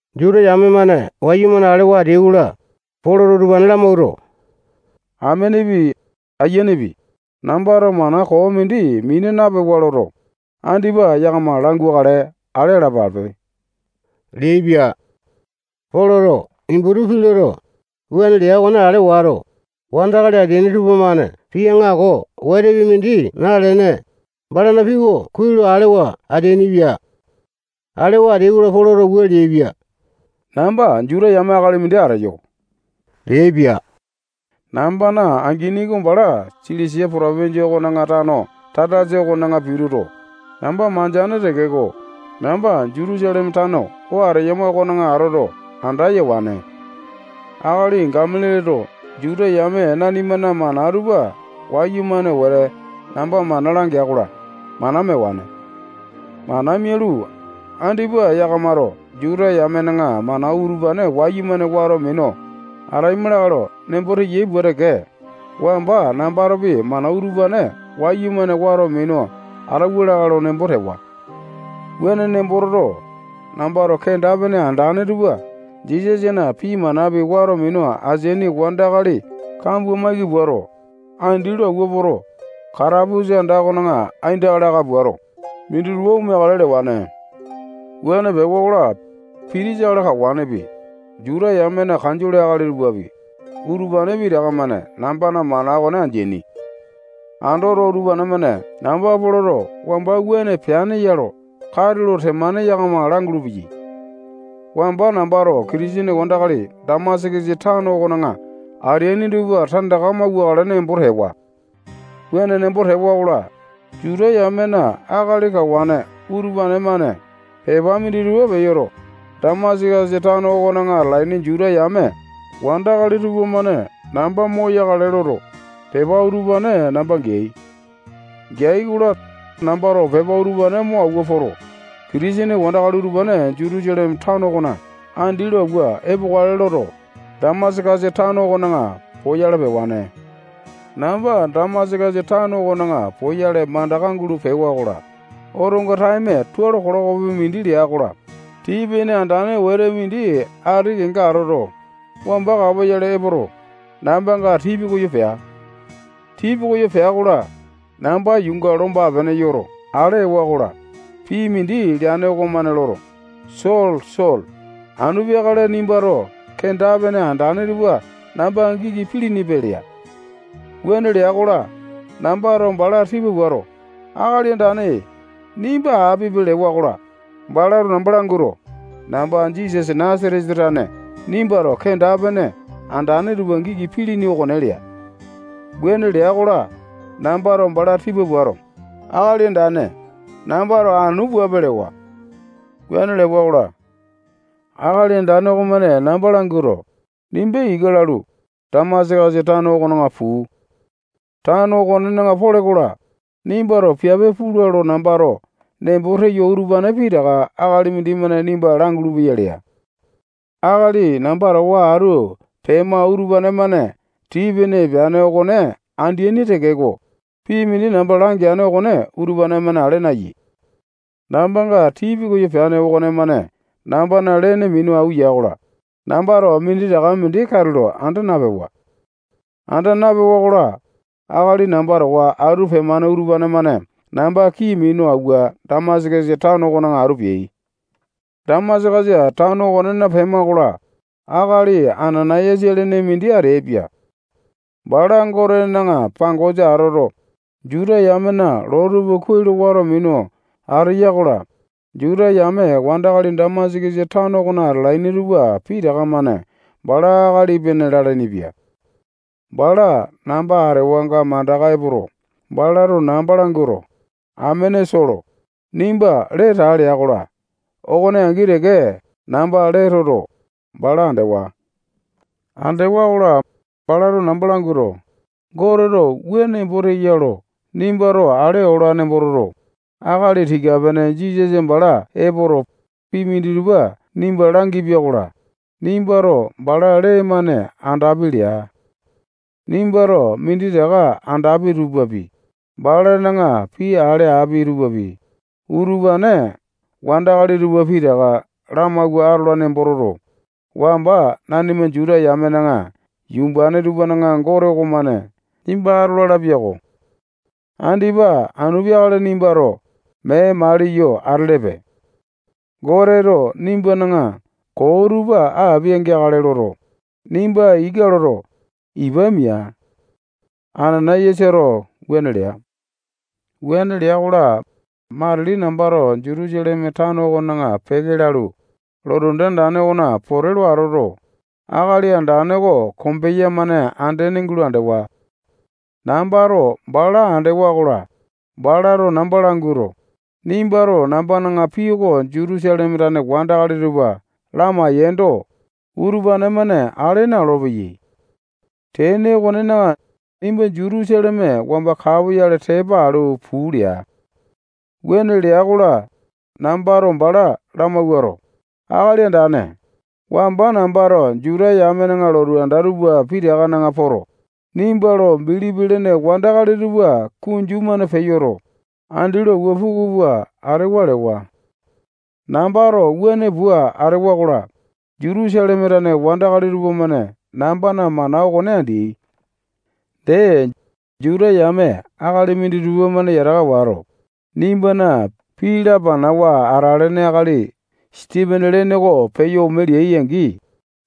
Juta yame-mane wayumane alewa ateyai-kola, Poloto utupane lamawuato, amenepi, ayianepi, nambato mana koo mindi mina napewa loto, andipa yakama langukale ale alapape leaipia. Poloto Iputu pii loto, wuane lea okone ale wato, wandakali ateaini tupamane pii aŋako wetepi mindi nalene, balana pii oko kuai lo alewa ateainipia. Alewa ateai-kola, Poloto wua leaipia: Namba Juta yame akali mindi ateyo leaipia. Nambana angini oko bala Silisia potopinjia okona tano Tasasa okona pituto, namba mandeane tekeko, namba Jutusaleme tano oo ateyama okona atoto, anda yewane. Akali Gamalialeto Juta yame nanimana mana tupa wayumane wete namba mana langea-kola, mana mewane. Mana mialu, andipa yakamato Juta yamena mana utupane wayumane wato minu ataima lakae lo nembo teyai pua teke, wamba nambatopi mana utupane wayumane wato minu atauwa lakae lo nembo tewa. Wuane nembo toto, nambato kenda-pene andane tupa Jisasana pii manapi wato minu ateaini wandakali kambua maiki puato, andi lo awua poto, katapusa anda okona aindaka laka puato, minditupa omeakale lewane. Wuane pewa-kola, pitisa akali kawane okopi, Juta yamena kanjole akali tupapi, utupane pitaka-mane nambana mana okone andeaini. Andoto, utupane-mane namba Poloto wamba wuane peane lo katulo temane yakama langulu-peyai. Wamba nambato Kitisene wandakali Damasakasa tano okona ateani tupa tandaka mauwakale nembo tewa. Wuane nembo tewa-kola, Juta yamena akali kawane utupane-mane pepa minditupa peyoto, Damasakasa tano okona atalaini Juta yame wandakali tupamane namba moyakale loto, pepa utupane namba geai. Geai-kola, nambato pepa utupane mo awua poto, Kitisene wandakali utupane Jutusaleme tano okona andi lo awua epokale loto, Damasakasa tano okona poyale pewane. Namba Damasakasa tano okona poyale mandaka gulo pewa-kola, otonga taeme tualo kilokopi mindi lea-kola, tii-pene andane wete mindi ati kenga atoto, wamba kapoyale epoto, nambanga tii pikoyo pea. Tii pikoyo pea-kola, namba yuunga lomba-pene yoto ale ewa-kola, pii mindi leane okomane loto, Solo, Solo, anu peakale nimbato kenda-pene andane tupa namba giki pilinipe lea. Wuane lea-kola, nambato bala tipa puato, Akali Andane, nimba apipe lewa-kola, balato namba languato, namba Jisasa Nasatesa tane nimbato kenda-pene andane tupa giki pilini okone lea. Wuane lea-kola, nambato bala tipa puato, Akali Andane, nambato anu puape lewa. Wuane lewa-kola, Akali Andane okomane namba languato, nimba ika lalu, Damasakasa tano okona puu. Tano okonena pole-kola, nimbato piape pula lo nambato nembo teyo utupane pitaka akali mindimane nimba langulu-peya lea. Akali namba towa atu pemane utupane-mane tii-pene epeane okone andeaini tekeko, pii mindi namba langeane okone utupane-mane ale nayai. Nambanga tii pikoyo peane okonemane nambana lene au ya-kola, nambato minditaka mindi katulo anda napewa. Anda napewa-kola, akali namba towa atu pemane utupane-mane namba kii minu awua Damasakasa tano okona atu peai. Damasakasa tano okonena pema-kola, akali Anana-yasa lene mindi ateaipia. Bala Gotena pangosa atoto, Juta yamena loo tupa kuai lo wato minu ateya-kola, Juta yame wandakali Damasakasa tano okona atalaini tupa pitaka-mane bala akali epene lalainipia. Bala namba atewanga mandaka epoto, balato namba languato, amene Solo, nimba lee taa lea-kola, okone angi teke namba lee toto, bala andewa. Andewa-kola, balato namba languato, Goteto wua nembo teya lo nimbato ale ola nembo toto, akali tika-pene Jisasa bala epoto, pii minditupa nimba langipia-kola, nimbato bala lee-mane andapi leaipia. Nimbato minditaka andapi tupapi, balana pii ale api tupapi, utupane wandakali tupa pitaka lamawua atola nembo toto, wamba nanima Juta yamena yumbane tupana Gote okomane nimba atola lapia-ko. Andipa anu peakale nimbato mee maliyo atelepe. Goteto nimbana koo tupa apia-geakale loto, nimba ika loto, ipa mia. Anana-yasato wuane lea. Wuane lea-kola, matili nambato Jutusaleme tano okona peke lalu, lotu anda andane okona pote lo atoto, Akali Andane oko kombeya-mane andene gulo andewa. Nambato bala andewa-kola, balato namba languato, nimbato nambana pii oko Jutusaleme tane wandakali tupa lamaendo, utupane-mane ale na-olopeyai. Tene okonena, nimba Jutusaleme wamba kapoyale tepa alu puu lea. Wuane lea-kola, nambato bala lamawuato, Akali Andane, wamba nambato Juta yamena lotu anda tupa pitakana poto, nimba lo bilipi lene wandakali tupa kunju-mane peyoto, andi lo awua puku pua atewa lewa. Nambato wuane pua atewa-kola, Jutusaleme tane wandakali tupamane nambana mana okone andeai. Dee, Juta yame akali minditupa-mane yataka wato, nimbana pii lapanawa atalane akali Sipene lene oko peyo ome leai-angi,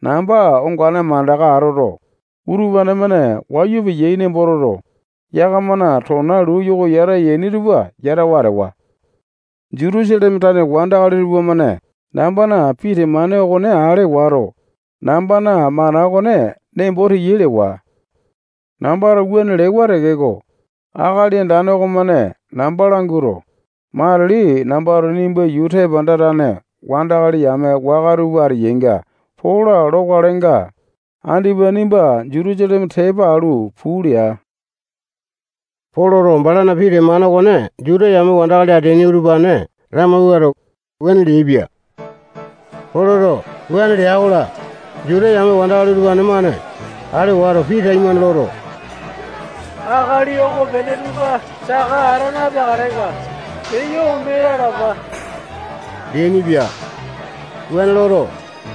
namba ongane mandaka atoto, utupane-mane wayu peyai nembo toto, yakamana tona luu yoko yata yaini tupa yatawa atewa. Jutusaleme tane wandakali tupamane nambana pii temane okone ale wato, nambana mana okone nembo teyai lewa. Nambato wuane lewa tekeko, Akali Andane okomane namba languato, matili nambato nimba yuu tepanda tane wandakali yame waka tupa ateyainga pola lokalenga, andipa nimba Jutusaleme tepa alu puu lea. Poloto balana pii temane okone Juta yame wandakali ateaini utupane lamawuato, wuane leaipia. Poloto wuane lea-kola, Juta yame wandakali utupane-mane ale wato, pii taimane loto, akali okopene tupa saka ata napeakalenga, peyo ome lalapa leainipia. Wuane loto,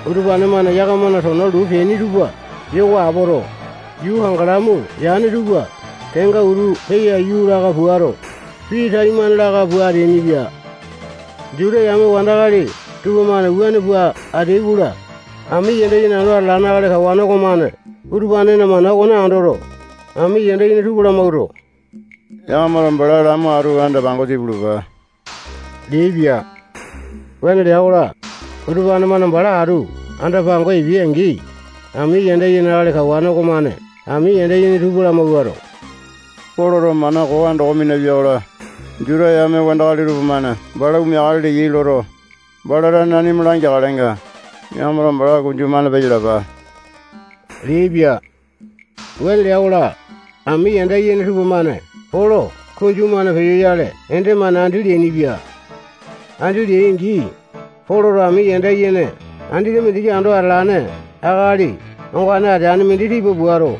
utupane-mane yakamana tona luu peaini tupa yoko apoto, yuu kangalamu yane tupa kenga utu peya aiyu laka puato, pii taimane laka pua ateainipia. Juta yame wandakali tupamane wuane pua ateai-kola, ami yanda yene ando atalane akali kawane okomane utupanena mana okone andoto, ami yanda yene tupa lamawuato, yakamato bala lamo atu anda-pangosa ipulupa leaipia. Wuane lea-kola, utupane-mane bala atu anda-pangosa epeai-angi, ami yanda yene akali kawane okomane ami yanda yene tupa lamawuato, Poloto mana koo andoko minapia-kola, Juta yame wandakali tupamane bala omeakale leyai loto, bala tane nanima langeakalenga, yakamato bala kunju-mane peyalapa leaipia. Wuane lea-kola, ami yanda yene tupamane Polo kunju-mane peyoyale ende-mane andi leainipia. Andi leai-angi, Poloto ami yanda yene andete mindiki ando atalane akali ongane ateane mindi tipa puato,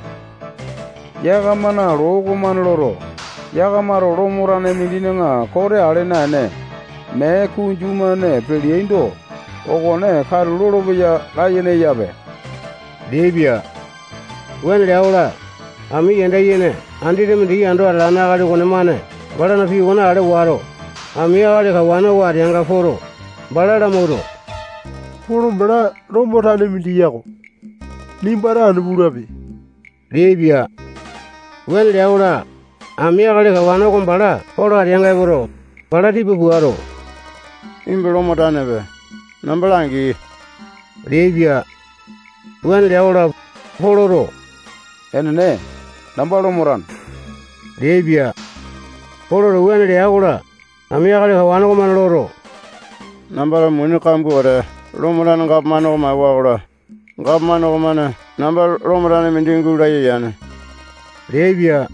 yakamana loo okomane loto, yakamato Lomo tane mindina kote ale naene, mee kunju-mane peleaindo, okone katu lolopeya layene eyape leaipia. Wuane lea-kola, ami yanda yene andete mindiki ando atalane akali okonemane balana pii okone ale wato, ami akali kawane oko ateanga poto, bala lamawuato, Polo bala Lomo tane mindi yako. Nimbato anu pulape leaipia. Wuane lea-kola, ami akali kawane oko bala Polo ateanga epoto, bala tipa puato, nimba Lomo tanepe. Namba langi leaipia. Wuane lea-kola, Poloto enene, namba Lomo tane leaipia. Poloto wuane lea-kola, ami akali kawane okomane loto, nambato muni kambua wete Lomo tane gapomane oko maewa-kola, gapomane okomane namba Lomo tane mindi gulaya yane leaipia.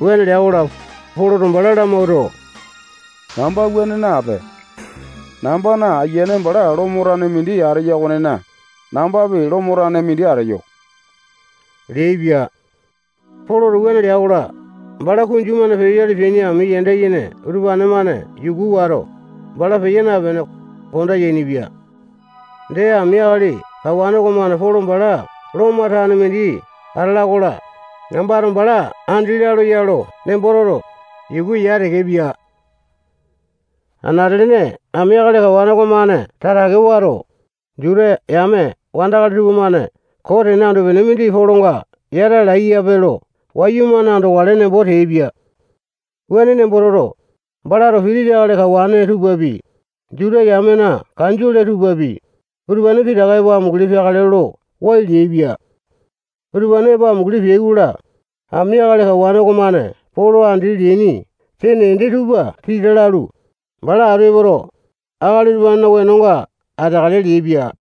Wuane lea-kola, Poloto bala lamawuato, namba wuane nape. Nambana ayiane bala Lomo tane mindi ateya okonena, nambapi Lomo tane mindi ateyo leaipia. Poloto wuane lea-kola, bala kunju-mane peyoyale peaini ami yanda yene utupane-mane yuku wato, bala peya napene, konda yainipia. Dee, ami akali kawane okomane Polo bala Lomo tane mindi atala-kola, nambato bala andi lalo ya lo nembo toto, yuku ya tekepia. Anate-lene ami akali kawane okomane tatake wato, Juta yame wandakali tupamane koo tene anu-pene mindi Polonga yata alaipe lo wayumane andokale nembo teaipia. Wuane nembo toto, balato pitisa akali kawane tupapi, Juta yamena kanjole tupapi, utupane pitaka epo amunguli peakale lo wai leaipia. Utupane epo amunguli peai-kola, ami akali kawane okomane Polo andi leaini sene ende tupa tita lalu, bala atu epoto, akali utupanena wenonga ateakale leaipia.